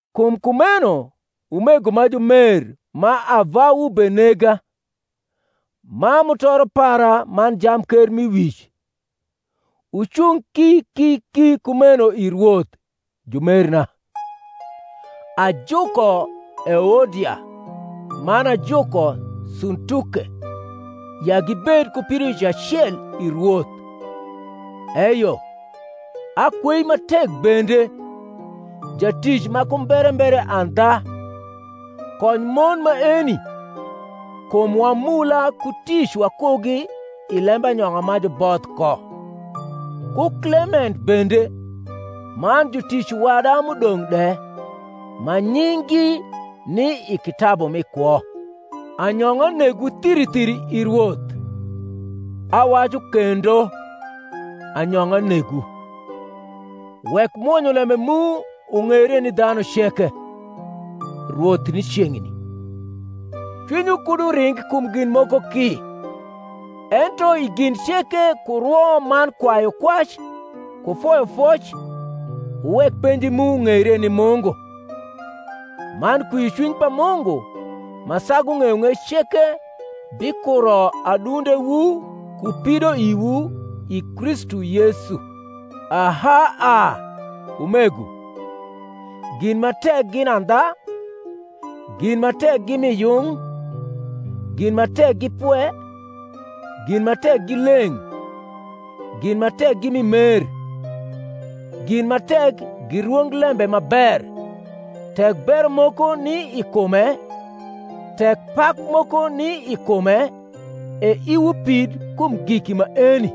Kum kumeno, umego ma jumer ma avawu benega, ma mutoro para man jamkermiwic, wucung ki ki ki kumeno i Rwoth, jumerna. Ajuko Euodia, man ajuko Suntuke, ya gibed ku pidoic acel i Rwoth. Eyo, akwei ma tek bende, jatic ma ku mberembere andha, kony mon maeni, kum wamula ku tic wakugi i lembanyong’a ma juboth ko, ku Klement bende, man jutic wada m’udong’ de, ma nying’gi ni i kitabu mi kwo. Anyong’a negwu thiri thiri i Rwoth: awacu kendo, Anyong’a negwu. Wek mwonyolembe mu ung’eire ni dhanu ceke. Rwoth ni ceng’ni. Cwinywu kud uring kum gin moko ki; ento i gin ceke ku rwo man kwayukwac ku foyofoc wuwek penji mu ung’eire ni Mungu. Man kwiocwiny pa Mungu, ma sagu ng’eyong’ec ceke, bikuro adundewu ku pidoiwu i Kristu Yesu. Aha a, umego, gin ma tek gin andha, gin ma tek gi mi yung, gin ma tek gi pwe, gin ma tek gi leng’, gin ma tek gi mi mer, gin ma tek gi rwonglembe ma ber; tek bero moko ni i kume, tek pak moko ni i kume, e iwu pid kum giki maeni.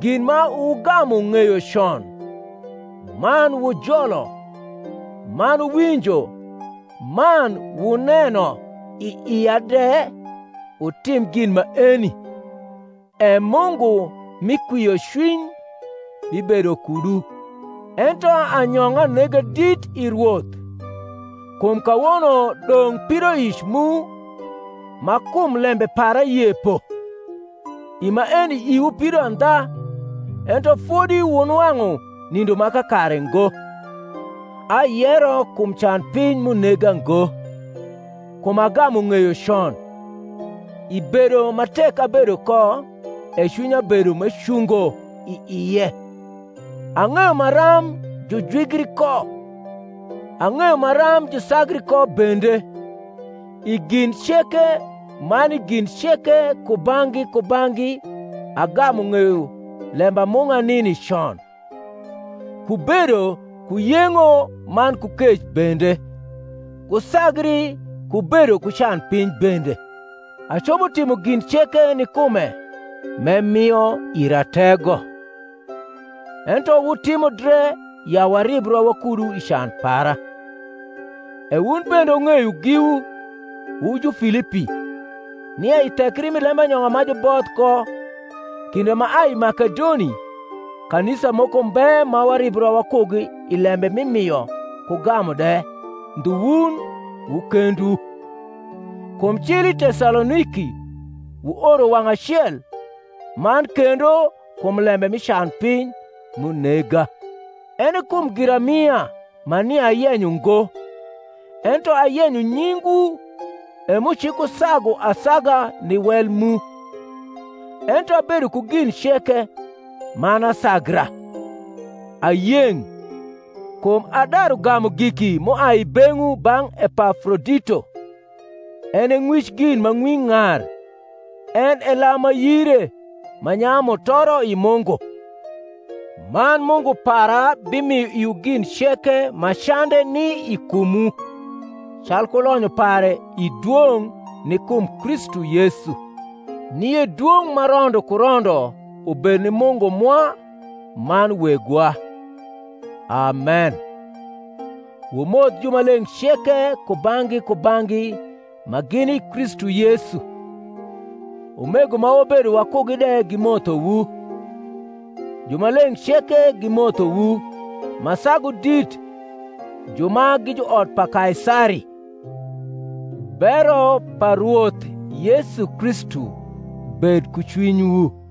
Gin ma wugamu ng’eyo con, man wujolo man wuwinjo man wuneno i ia de, wutim gin maeni: e Mungu mi kwiocwiny bibedo kudu. Ento anyong’a nega dit i Rwoth, kum kawono dong’ pidoic mu ma kum lembe para yepo; i maeni iwu pido andha, ento fodi wunwang’u nindo ma kakare ngo. Ayero kum canpiny m’unega ngo: kum agamu ng’eyo con, i bedo ma tek abedo ko, e cwinya bedo m’ecungo i ie. Ang’eyo maram jujwigri ko, ang’eyo maram jusagri ko bende: i gin ceke man i gin ceke kubang’gi kubang’gi agamu ng’eyo lembamung’a nini con, ku bedo ku yeng’o man ku kec bende, ku sagri ku bedo ku canpiny bende. Acopo timo gin ceke ni kume m’emio ira tego. Ento wutimo dre ya waribra wakudu i can para. E wun bende wung’eyo giwu, wu Jufilipi, nia i thekri mi lembanyong’a ma juboth ko, kinde m’aai i Makedoni, kanisa moko mbe ma waribra wakugi i lembe mi mio ku gamu de ndhu wun wu kendwu; kum cil i Tesaloniki wuoro wang’ acel man kendo kum lembe mi canpiny m’unega. Ene kum giramia ma nia ayenyo ngo; ento ayenyo nyingwu e m’ucikusagu asaga ni wel mu. Ento abedo ku gin ceke, man asagra: ayeng’, kum adaru gamu giki m’uai i beng’wu bang’ Epafrodito, en e ng’wic gin ma ng’wi ng’ar, en e lam ma yire, ma nyayu mutoro i Mungu. Man Mungu para bimio iwu gin ceke ma cande ni i kumwu calku lonyo pare i dwong’ ni kum Kristu Yesu. Nie dwong’ ma rondo ku rondo ubed ni Mungu mwa man Wegwa. Amen. Wumoth jumaleng’ ceke kubang’gi kubang’gi ma gini i Kristu Yesu. Umego ma wabedo wakugi de gimothowu. Jumaleng’ ceke gimothowu, ma sagu dit ju ma gi juot pa Kaisari. Bero pa Rwoth Yesu Kristu bed ku cwinywu.